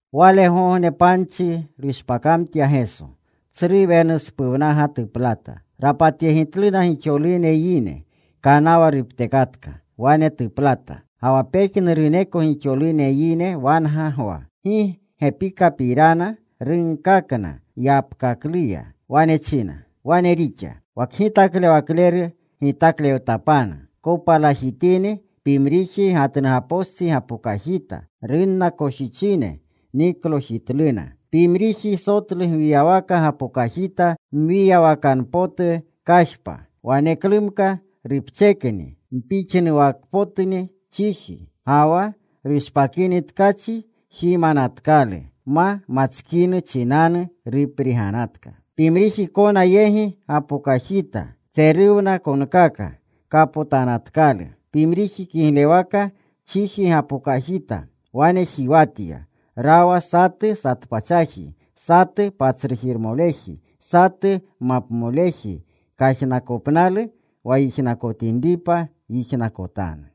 Walegogne panchi rushpakamtya Geso. Tsru wenuspuwnaga tuplata. Rapatyegitluna gixolune yine. Kanawa ruptekatka. Wane tuplata. Ga wa pejnuruneko gixolune yine wanga gwa. Gi gepikapirana runkakna yapkakluya. Wane china, “Wane rixa. Wa kgitaklewakleru gitaklewtapanu. Kopalajitini pimriji gatnugapostsi gapokajita. Runna koshichine. Niklokajitluna. Pimriji sotlu gwiyawaka gapokajita mwiyawakanu potu kajpa. Waneklumka rupchekni. Mpixnuwakapotni chiji. Ga wa rushpakini tkachi jimanatkalu. Ma matskinu chinanu rupriganatka. Pimriji kona yegi gapokajita. Tseruwna konkaka. Kapotanatkalu. Pimriji kiglewaka chiji gapokajita. Wane jiwatya. Rawa satu satpachaji, satu patsrujirmoleji, satu mapmoleji. Kajnakopnalu wa yijnakotinripa, yijnakotanu.”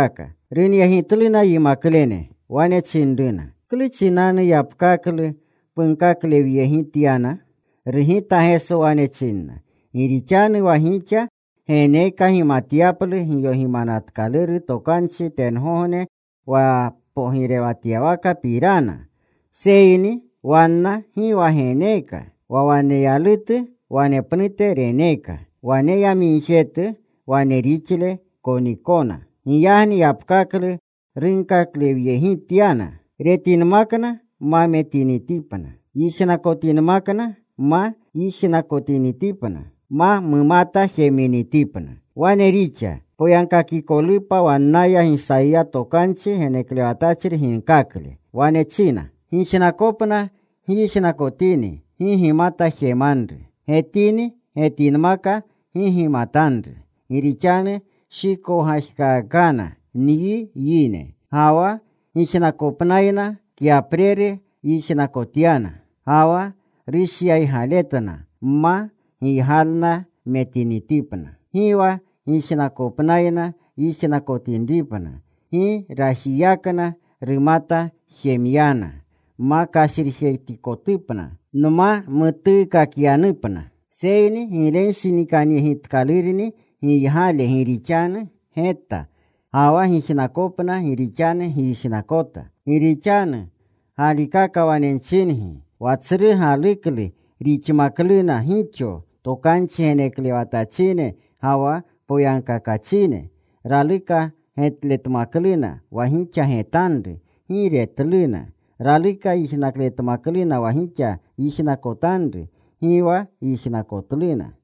Runyegitluna yimaklene. Wane chinruna, “¿Klu chinanu yapkaklu punkaklewyegityana?” Rugita Geso. Wane chinna, “Gi rixanu wa gixa geneeka gimatyaplu giyogimanatkaluru tokanchi tengogne pogirewatyawakapirana, seyni wanna gi wa geneeka. Wa waneyalutu wanepnute reneeka. Waneyamigjetu wane rixle konikona. Giyagni yapkaklu nunkaklewyegityana, retinmakna ma metinitipna, yijnakotinmakna ma yijnakotinitipna, ma mumata jeminitipna. Wane rixa poyagkakikolupa wannaya Gisayiya tokanchi geneklewatchri ginkakle. Wane china: Gijnakopna gyijnakotini, gi gimata jemanru. Getini getinmaka, gi gimatanru. Gi rixanu shikowgajkaakana nyi yine. Ga wa gijnakopnayna kyapreru yijnakotyana. Ga wa rushyaygaletna ma giygalna metinitipna; gi wa gijnakopnayna yijnakotinripna; gi rajiyakna rumata jemyana; ma kashrijetikotupna, nma mutuukakyanupna. “Seyni giglenshinikanyegitkalurni giygale gi rixanu geta, ga wa gijnakopna gi rixanu gyijnakota. Gi rixanu galikaka wane nchingi, wa tsru galuklu rixmakluna gixo tokanchi geneklewatachine ga wa poyagkakachine. Raluka getletmakluna wa gixa getanru. Gi retluna. Raluka yijnakletmakluna wa gixa yijnakotanru. Gi wa yijnakotluna.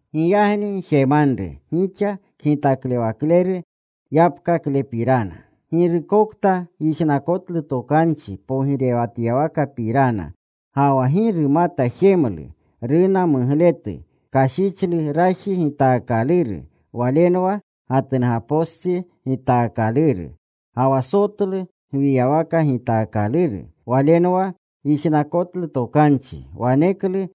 “Giyagni gjemanru gixa kgitaklewakleru yapkaklepirana. Girukokta yijnakotlu tokanchi pogirewatyawakapirana, ga wa gi rumata jemlu, runa mugletu. Kashichlu raji gitaakaluru. Walenwa gatnugapostsi gitaakaluru. Ga wa sotlu gwiyawaka gitaakaluru, walenwa yijnakotlu tokanchi. Waneklu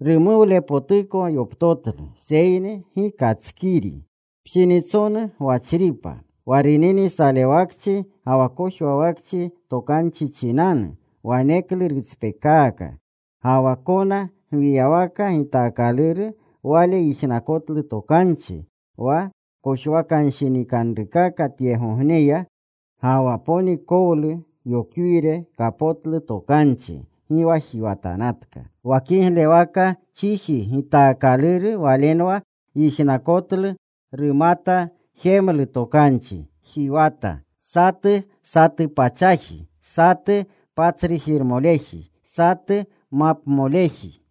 rumuwlepotuko yoptotlu. Seyni gi katskiri. Pshinitsonu gwachripa. Wa runini salewakchi ga wa kojwawakchi tokanchi chinanu, waneklu rutspekaaka. Ga wa kona gwiyawaka gitaakaluru wale yijnakotlu tokanchi. Wa kojwakanshinikanrukaka tyegogneya, ga wa ponikowlu yokwire kapotlu tokanchi. Gi wa jiwatanatka. Wa kiglewaka chiji gitaakaluru walenwa yijnakotlu. Rumatjemlu tokanchi. Jiwata: satu, satupachaji; satu, patsrujiremoleji; satu, mapmoleji.”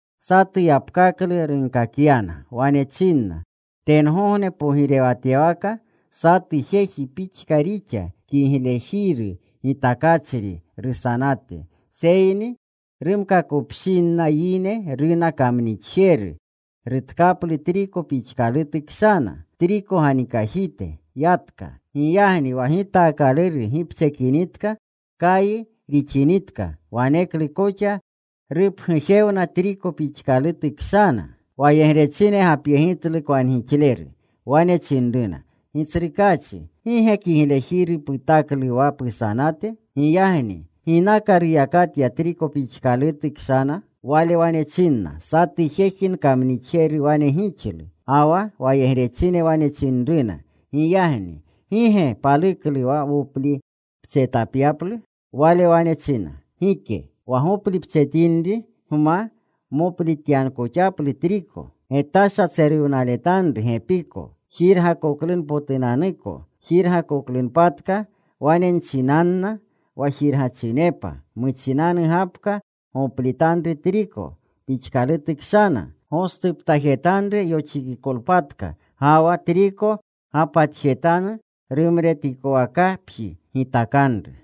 Satu yapkaklu runkakyana. Wane chinna, “Tengogne pogirewatyawaka satu jeji pixka rixa, kiglejiru gitakachri rusanate. Seyni rumkakopshinna yine runa kamnixjeru. Rutkaplu triko pixkalutu kshana, triko ganikajite. Yatka. Giyagni wa gitaakaluru gipchekinitka, kaji rixinitka, waneklu koxa rupgujewna triko pixkalutu kshana. “Wayegrechine gapyegitlu kwangixleru. Wane chinruna, ‘Gitsrukaachi, ¿gi ge kiglejiru putaklu wa pusanate? Giyagni ¿ginaka ruyakatya triko pixkalutu kshana?’ “Wale wane chinna, ‘Satu jeji nkamnixjeru wane gixlu.’ “Ga wa wayegrechine wane chinruna, ‘Giyagni ¿gi ge paluklu wa woplipchetapyaplu?’ “Wale wane china, ‘Gike. Wa goplipchetinri gma moplityakoxaplu triko. Getasha tseruwnaletanru gepiko, jirgakoklunpotunanuko. Jirgakoklunpatka, wane nchinanna wa jirgachinepa, “Muchinangapka goplitanru triko pixkalutu kshana. Gostuptajetanru yoxikikolpatka. Ga wa triko gapatjetanu. Rumretikowakapji gitakanru.”’”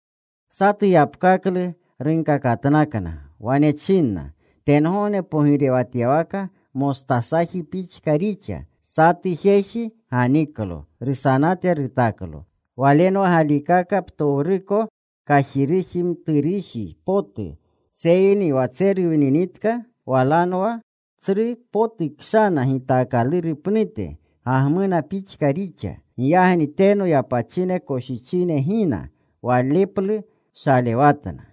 Satu yapkaklu runkakatnakna. Wane chinna, “Tengogne pogirewatyawaka mostasaji pixka rixa. Satu jeji ganiklo. Rusanate rutaklo. Walenwa galikaka ptowruko kajiruji mtserujitu potu. Seyni wa tseruwninitka walenwa tsru potu kshana gitaakaluru pnute. Gagmuna pixka rixa. Giyagni teno yapachine koshichine gina. Waleplu shalewatna.”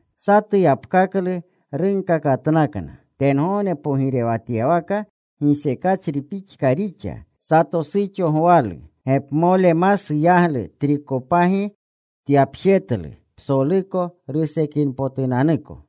Satu yapkaklu runkakatnakna: “Tengogne pogirewatyawaka gisekachri pixka rixa. Sato suxo gwalu. Gepmole masu yaglu trikopagi tyapjetlu, psoluko rusekinpotunanuko.”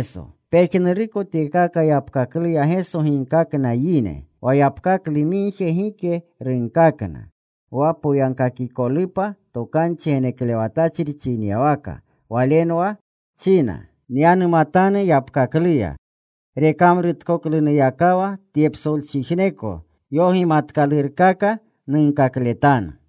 Pejnuruko tyekaka yapkakluya Geso ginkakna yine. Wa yapkaklu migje gike runkakna, wa poyagkakikolupa tokanchi geneklewatachri chinyawaka. Walenwa china: Nyanumatanu yapkakluya. Rekamrutkoklunuyakawa tye psolchijneko yogimanatkalurkaka nunkakletanu.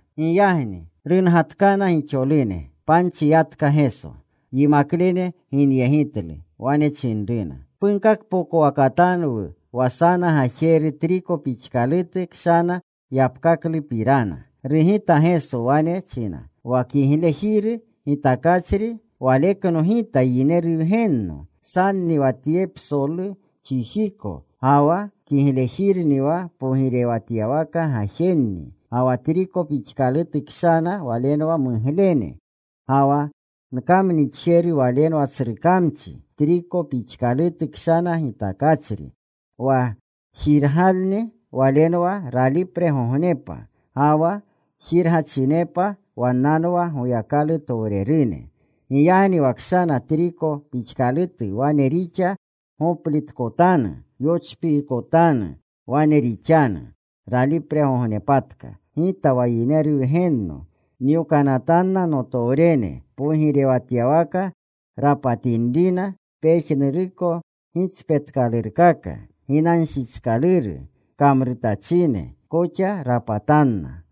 Giyagni rungatkana gixolune. Panchi yatka Geso. Yimaklene ginyegitlu. Wane chinruna, “Punkakpokowakatanwu wa sana gajeru triko pixkalutu kshana yapkaklupirana.” Rugita Geso. Wane china, “Wa kiglejiru gitakachri walekno Gita Yineru Wgenno. Sanni wa tye psolu chijiko. Ga wa kiglejirni wa pogirewatyawaka gajenni. Ga wa triko pixkalutu kshana walenwa muglene. Ga wa kamnixjeru walenwa tsru kamchi, triko pixkalutu kshana gitakachri. Wa jirgalni walenwa ralipregognepa. Ga wa jirgachinepa wannanwa Goyakalutowrerune. “Giyagni wa kshana triko pixkalutu wane rixa goplitkotanu. Yochpiikotanu. Wane rixanu ralipregognepatka: Gita wa Yineru Wgenno nyokanatanna notowrene, pogirewatyawaka rapatinrina pejnuruko gitspetkalurkaka. Ginanshichkaluru kamrutachine koxa rapatanna.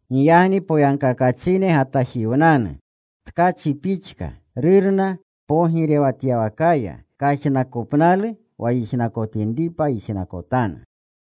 Giyagni poyagkakachine gatajiwnanu, tkachi pixka, Rurna pogirewatyawakaya. Kajnakopnalu wa yijnakotinripa yijnakotanu.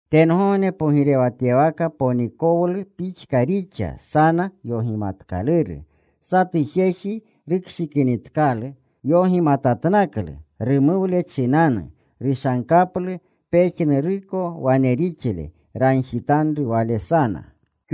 “Tengogne pogirewatyawaka ponikowlu pixka rixa sana yogimatkaluru. Satu jeji rukshikinitkalu, yogimatatnaklu. Rumuwle chinanu rushankaplu pejnuruko wane rixle. Ragjitanru wale sana.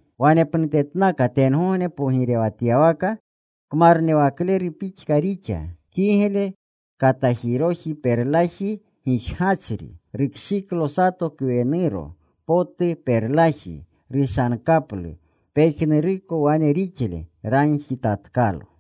“Wanepnutetnaka tengogne pogirewatyawaka kmarnewakleru pixka rixa, kigle katajiroji perlaji gijgachri. Rukshiklo sato kwenuro potu perlaji. Rushankaplu pejnuruko wane rixle. Ragjitatkalo.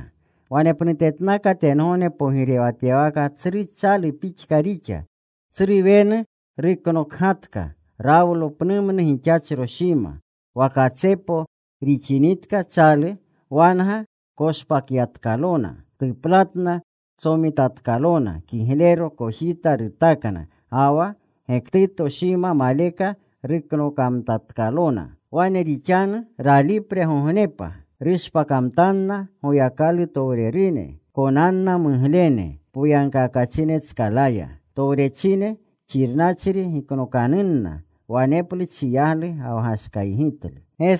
“Wanepnutetnaka tengogne pogirewatyawaka tsru chalu pixka rixa. Tsru wenu ruknokgatka. Rawlo pnumnu gixachro shima. Wa katsepo rixinitka chalu, wanga koshpatyatkalona. Tuplatna. Tsomitatkalona kiglero. Kojita rutakna. Ga wa gektuto shima maleka ruknokanatkalona. Wane rixanu ralipregognepa. Rushpakamtanna Goyakalutowrerune. Konanna muglene poyagkakachinetskalaya. Towrechine xirnachri giknokanunna. Waneplu chiyaglu ga wa gashkaygitlu.”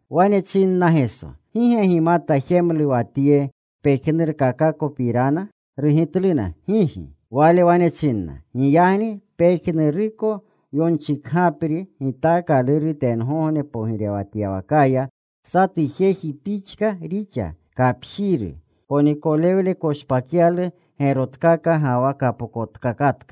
Wane chinna Geso, “¿Gi ge gimata jemlu wa tye pejnurkakakopirana?” Rugitluna, “Gigi.” Wale wane chinna, “Giyagni pejnuruko yonchikagapri ginkaakaluru tengogne pogirewatyawakaya, satu jeji pixka rixa kapjiru. Ponikolewle koshpakyalu gerotkaka ga wa kapokotkaka.”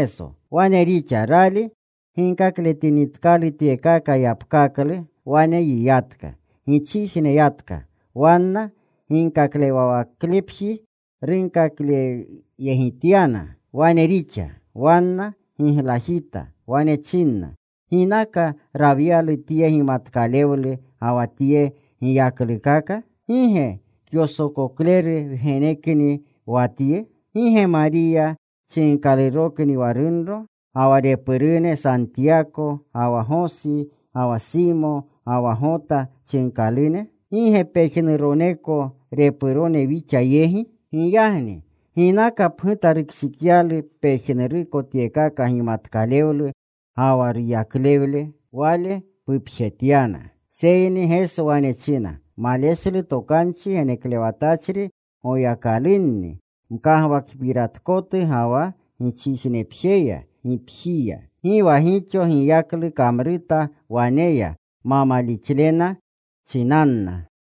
Wane rixa. Rali ginkakletinitkalu tyekaka yapkaklu, wane yiyatka. Gichijne yatka. Wanna ginkaklewawaklepji runkakjetyana. Wane rixa. Wanna giglajita. Wane chinna, “¿Ginaka rawyalu tye gimatkalewlu ga wa tye giyaklukaka? ¿Gi ge kyosokokleru wgenekni wa Tye? ¿Gi ge Mariya chinkalurokni wa runro? ¿Ga wa repurune Santiyako ga wa Gosi, ga wa Simo, ga wa Gota chinkalune? ¿Gi ge pejnuroneko repurone wixa yegi? ¿Giyagni ginaka pguta rukshikyalu pejnuruko tyekaka gimatkalewlu ga wa ruyaklewle?” Wale pupjetyana. Seyni Geso wane china, “Maleshlu tokanchi geneklewatachri Goyakalunni mkagwakpiratkotu ga wa gichijnepjeya, gipjiya.” Gi wa gixo giyaklu kamruta waneya ma malixlena chinanna.